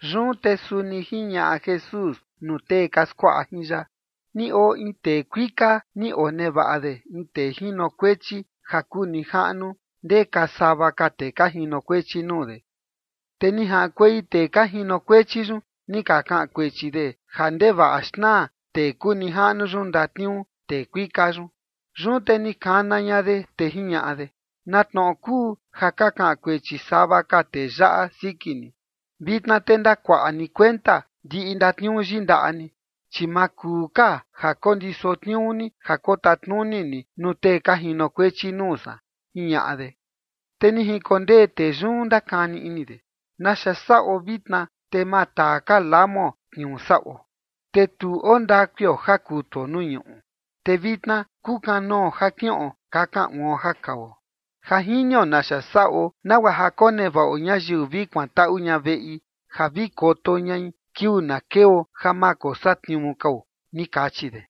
Yun te suni jiñaꞌa Jesús nuu tee ka skuaꞌa jin ya: ―Ni oo in tee kuika ni onevaꞌa de in tee jinokuechi ja kuu nijaꞌnu ndeka sava ka tee ka jinokuechi nuu de. Te ni jaꞌankuei tee ka jinokuechi yun, ni ka kaꞌan kuechi de ja ndevaꞌa xnaa tee kuu nijaꞌnu yun ndatniuu tee kuika yun. Yun te ni kana ña de, te jiñaꞌa de: “¿Na tnoꞌo kuu ja ka kaꞌan kuechi sava ka tee yaꞌa siki ni? Vitna te ndakuaꞌa ni kuenta ndiꞌi ndatniuu yindaꞌa ni, chi ma kuu ka ja kondiso tniuu ni ja kotatnuni ni nuu tee ka jinokuechi nuu san”, jiñaꞌa de. ’Te ni jinkondee tee yun ndakani ini de: “¿Naxa saꞌo vitna, te ma taa ka lamuo tniuu saꞌo? Te tu oo ndakuio ja kutuo nuu ñuꞌu, te vitna kukanoo ja kiꞌon kakan uon ja kao. Ja jinio naxa saꞌo nagua ja konevaꞌo ñayiu vi kuantaꞌu ña veꞌi ja vi koto ñai kiuu na keo ja ma kosatniuu kao”, ni kachi de.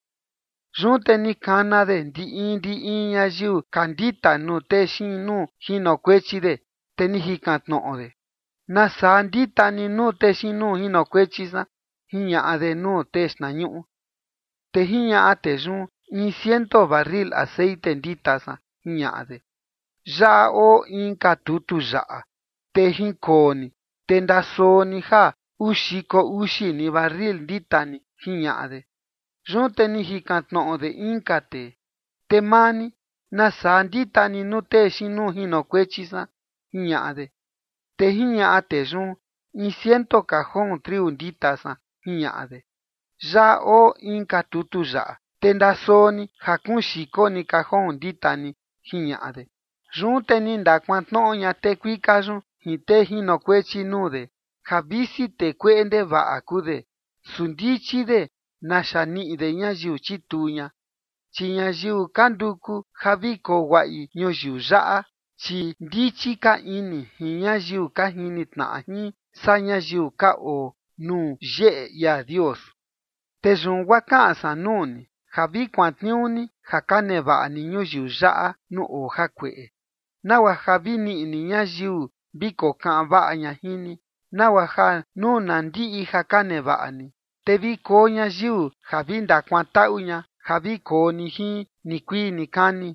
’Yun te ni kana de ndi in ndi in ñayiu ka ndita nuu tee xiin nuu jinokuechi de, te ni jikan tnoꞌo de: “¿Nasaa ndita ni nuu tee xiin nuu jinokuechi san?”, jiñaꞌa de nuu tee xtnañuꞌu. ’Te jiñaꞌa tee yun: “In ciento barril texeꞌen ndita san”, jiñaꞌa de. “Yaꞌa oo inka tutu yaꞌa, te jinkoo ni, te ndasoo ni ja uu xiko uxi ni barril ndita ni”, jiñaꞌa de. Yun te ni jikan tnoꞌo de inka tee: “Te maa ni, ¿nasaa ndita ni nuu tee xiin nuu jinokuechi san?”, jiñaꞌa de. Te jiñaꞌa tee yun: “In ciento cajón triu ndita san”, jiñaꞌa de. “Yaꞌa oo inka tutu yaꞌa, te ndasoo ni ja kuun xiko ni cajón ndita ni”, jiñaꞌa de. ’Yun te ni ndakuantnoꞌo ña tee kuika yun jin tee jinokuechi nuu de, ja visi tee kueꞌe ndevaꞌa kuu de, su ndichi de naxa niꞌi de ñayiu chituu ña. Chi ñayiu ka nduku ja vi koo guaꞌi ñuyiu yaꞌa, chi ndichi ka ini jin ñayiu ka jini tnaꞌa jin saa ñayiu ka oo nuu yeꞌe ia Dios. ’Te yun guaa kaꞌan san nuu ni ja vi kuantniuu ni ja ka nevaꞌa ni ñuyiu yaꞌa nuu oo jakueꞌe, nagua ja vi niꞌi ni ñayiu vi kokaꞌan vaꞌa ña jin ni, nagua ja nuu na ndiꞌi ja ka nevaꞌa ni, te vi koo ñayiu ja vi ndakuantaꞌu ña ja vi koo ni jin nikuii nikani.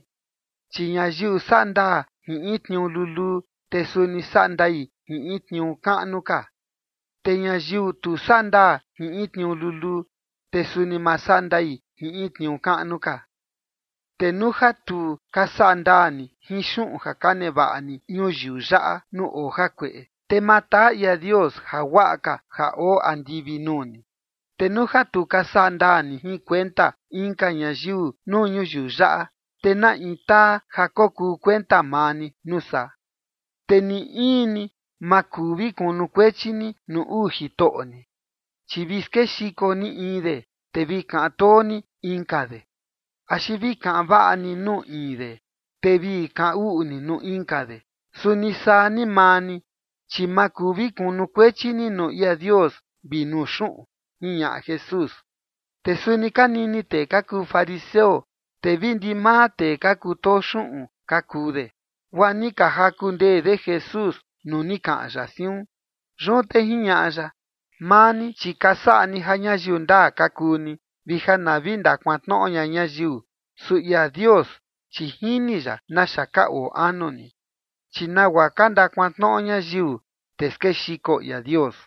’Chi ñayiu saꞌa ndaa jin in tniuu luluu, te suni saꞌa ndai jin in tniuu kaꞌnu ka. Te ñayiu tu saꞌa ndaa jin in tniuu luluu, te suni ma saꞌa ndai jin in tniuu kaꞌnu ka. Te nuu ja tu ka saꞌa ndaa ni jin xuꞌun ja ka nevaꞌa ni ñuyiu yaꞌa nuu oo jakueꞌe, te ma taa ia Dios jaguaꞌa ka ja oo andivi nuu ni. Te nuu ja tu ka saꞌa ndaa ni jin kuenta inka ñayiu nuu ñuyiu yaꞌa, te ¿na in taa ja kokuu kuenta maa ni, nuu saa? ’Te ni in ni ma kuu vi kunukuechi ni nuu uu jitoꞌo ni, chi vi skexiko ni in de, te vi kaꞌan too ni inka de. Axi vi kaꞌan vaꞌa ni nuu in de, te vi kaꞌan uꞌu ni nuu inka de. Suni saa ni maa ni, chi ma kuu vi kunukuechi ni nuu ia Dios vi nuu xuꞌun ―jiñaꞌa Jesús. Te suni ka nini tee ka kuu fariseo, te vi ndimaa tee ka kutoo xuꞌun ka kuu de, guaa ni ka jaku ndee de Jesús nuu ni kaꞌan ya siun. Yun te jiñaꞌa ya: ―Maa ni, chi ka saꞌa ni ja ñayiu ndaa ka kuu ni, vi ja na vi ndakuantnoꞌo ña ñayiu. Su ia Dios, chi jini ya naxa ka oo anu ni. Chi nagua ka ndakuantnoꞌo ñayiu, te skexiko ia Dios.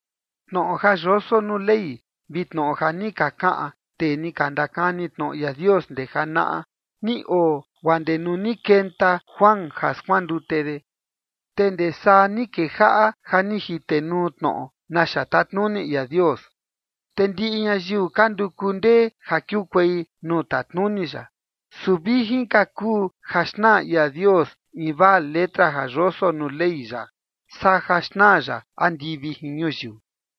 ’Tnoꞌo ja yoso nuu Ley vi tnoꞌo ja ni ka kaꞌan tee ni ka ndakani tnoꞌo ia Dios ndee janaꞌa, ni oo guaa ndee nuu ni kenta Juan ja skuandute de. Te ndee saa ni kejaꞌa ja ni jitenuu tnoꞌo naxa tatnuni ia Dios, te ndiꞌi ñayiu ka nduku ndee ja kiukuei nuu tatnuni ya. Su vijin ka kuu ja xnaa ia Dios in vaa letra ja yoso nuu Ley ya, saa ja xnaa ya andivi jin ñuyiu.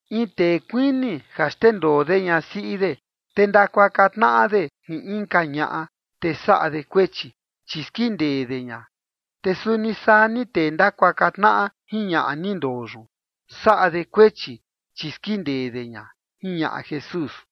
’In tee kuini ja xndendoo de ñasiꞌi de, te ndakuaka tnaꞌa de jin inka ñaꞌa, te saꞌa de kuechi, chi skindee de ña. Te suni saa ni tee ndakuaka tnaꞌa jin ñaꞌa ni ndoo yun saꞌa de kuechi, chi skindee de ña ―jiñaꞌa Jesús.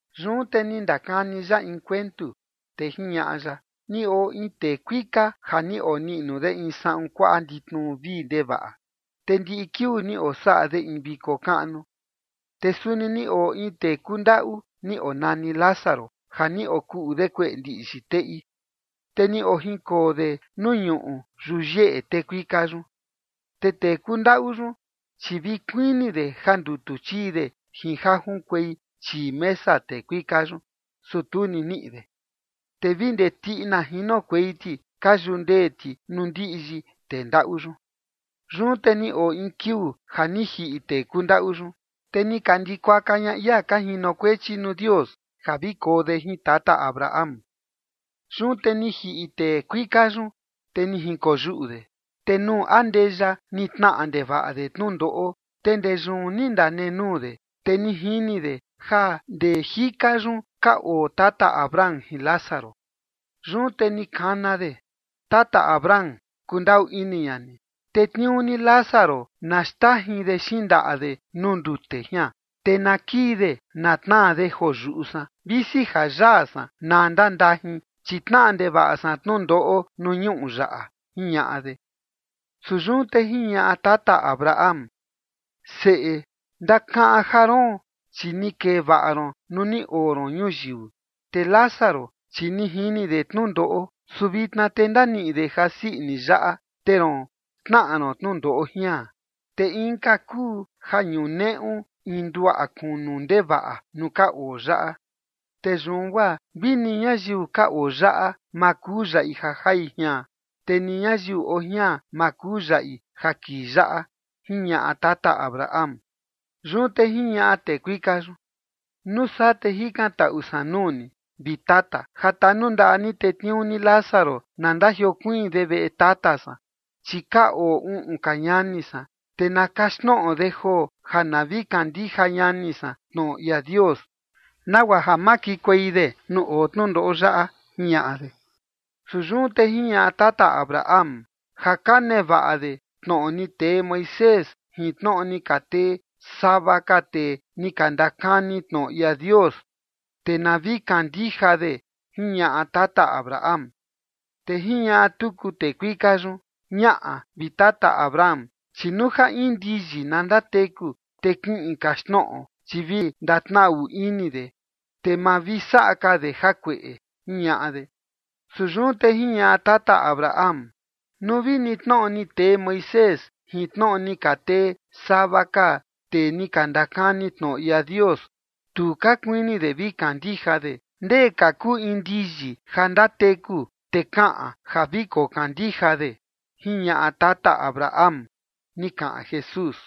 Yun te ni ndakani ya in kuentu, te jiñaꞌa ya: ―Ni oo in tee kuika ja ni oniꞌnu de in saꞌun kuaꞌa nditnu vii ndevaꞌa, te ndiꞌi kiuu ni osaꞌa de in viko kaꞌnu. Te suni ni oo in tee kundaꞌu, ni onani Lázaro, ja ni okuꞌu de kueꞌe ndiꞌyi teꞌi. Te ni ojinkoo de nuu ñuꞌu yuyeꞌe tee kuika yun. Te tee kundaꞌu yun, chi vi kuini de ja ndutu chii de jin ja junkuei chii mesa tee kuika yun, su tu ni niꞌi de. Te vi ndee tiꞌina jinokuei ti ka yundee ti nuu ndiꞌyi tee ndaꞌu yun. Yun te ni oo in kiuu ja ni jiꞌi tee kundaꞌu yun. Te ni ka ndikuaka ña ia ka jinokuechi nuu Dios ja vi koo de jin tata Abraham. Yun te ni jiꞌi tee kuika yun, te ni jinkoyuꞌu de. Te nuu andeya ni tnaꞌa ndevaꞌa de tnundoꞌo. Te ndee yun ni ndanenuu de, te ni jini de ja ndee jika yun ka oo tata Abraham jin Lázaro. Yun te ni kana de: “Tata Abraham, kundaꞌu ini ña ni. Tetniuu ni Lázaro na xndajin de xindaꞌa de nuu ndute jian, te na kii de na tnaa de joo yuꞌu san, visi ja yaa san na ndandajin, chi tnaꞌa ndevaꞌa san tnundoꞌo nuu ñuꞌu yaꞌa”, jiñaꞌa de. Su yun te jiñaꞌa tata Abraham: “Seꞌe, ndakaꞌan ja roon, chi ni kee vaꞌa ron nuu ni oo ron ñuyiu, te Lázaro, chi ni jini de tnundoꞌo. Su vitna te ndaniꞌi de ja sii ini yaꞌa, te roon tnaꞌa ron tnundoꞌo jian. Te inka kuu ja ñuneꞌu in nduaꞌa kunu ndevaꞌa nuu ka oo yaꞌa. Te yun guaa vi ni ñayiu ka oo yaꞌa ma kuu yaꞌi ja jai jian, te ni ñayiu oo jian ma kuu yaꞌi ja kii yaꞌa”, jiñaꞌa tata Abraham. Yun te jiñaꞌa tee kuika yun: “Nuu saa te jikantaꞌu san nuu ni, vi tata, ja tanundaꞌa ni tetniuu ni Lázaro na ndajiokuiin de veꞌe tata san, chi ka oo uꞌun ka ñani san, te na kaxtnoꞌo de joo ja na vi kandija ñani san tnoꞌo ia Dios, nagua ja ma kikuei de nuu oo tnundoꞌo yaꞌa”, jiñaꞌa de. Su yun te jiñaꞌa tata Abraham: “Ja ka nevaꞌa de tnoꞌo ni tee Moisés jin tnoꞌo ni ka tee sava ka tee ni ka ndakani tnoꞌo ia Dios, te na vi kandija de”, jiñaꞌa tata Abraham. Te jiñaꞌa tuku tee kuika yun: “Ñaꞌa, vi tata Abraham, chi nuu ja in ndiyi na ndateku, te kiꞌin kaxtnoꞌo, chi vi ndatnaꞌu ini de, te ma vi saꞌa ka de jakueꞌe”, jiñaꞌa de. Su yun te jiñaꞌa tata Abraham: “Nuu vini tnoꞌo ni tee Moisés jin tnoꞌo ni ka tee sava ka tee ni ka ndakani tnoꞌo ia Dios, tu ka kuini de vi kandija de, ndee ka kuu in ndiyi ja ndateku te kaꞌan ja vi kokandija de”, jiñaꞌa tata Abraham ―ni kaꞌan Jesús.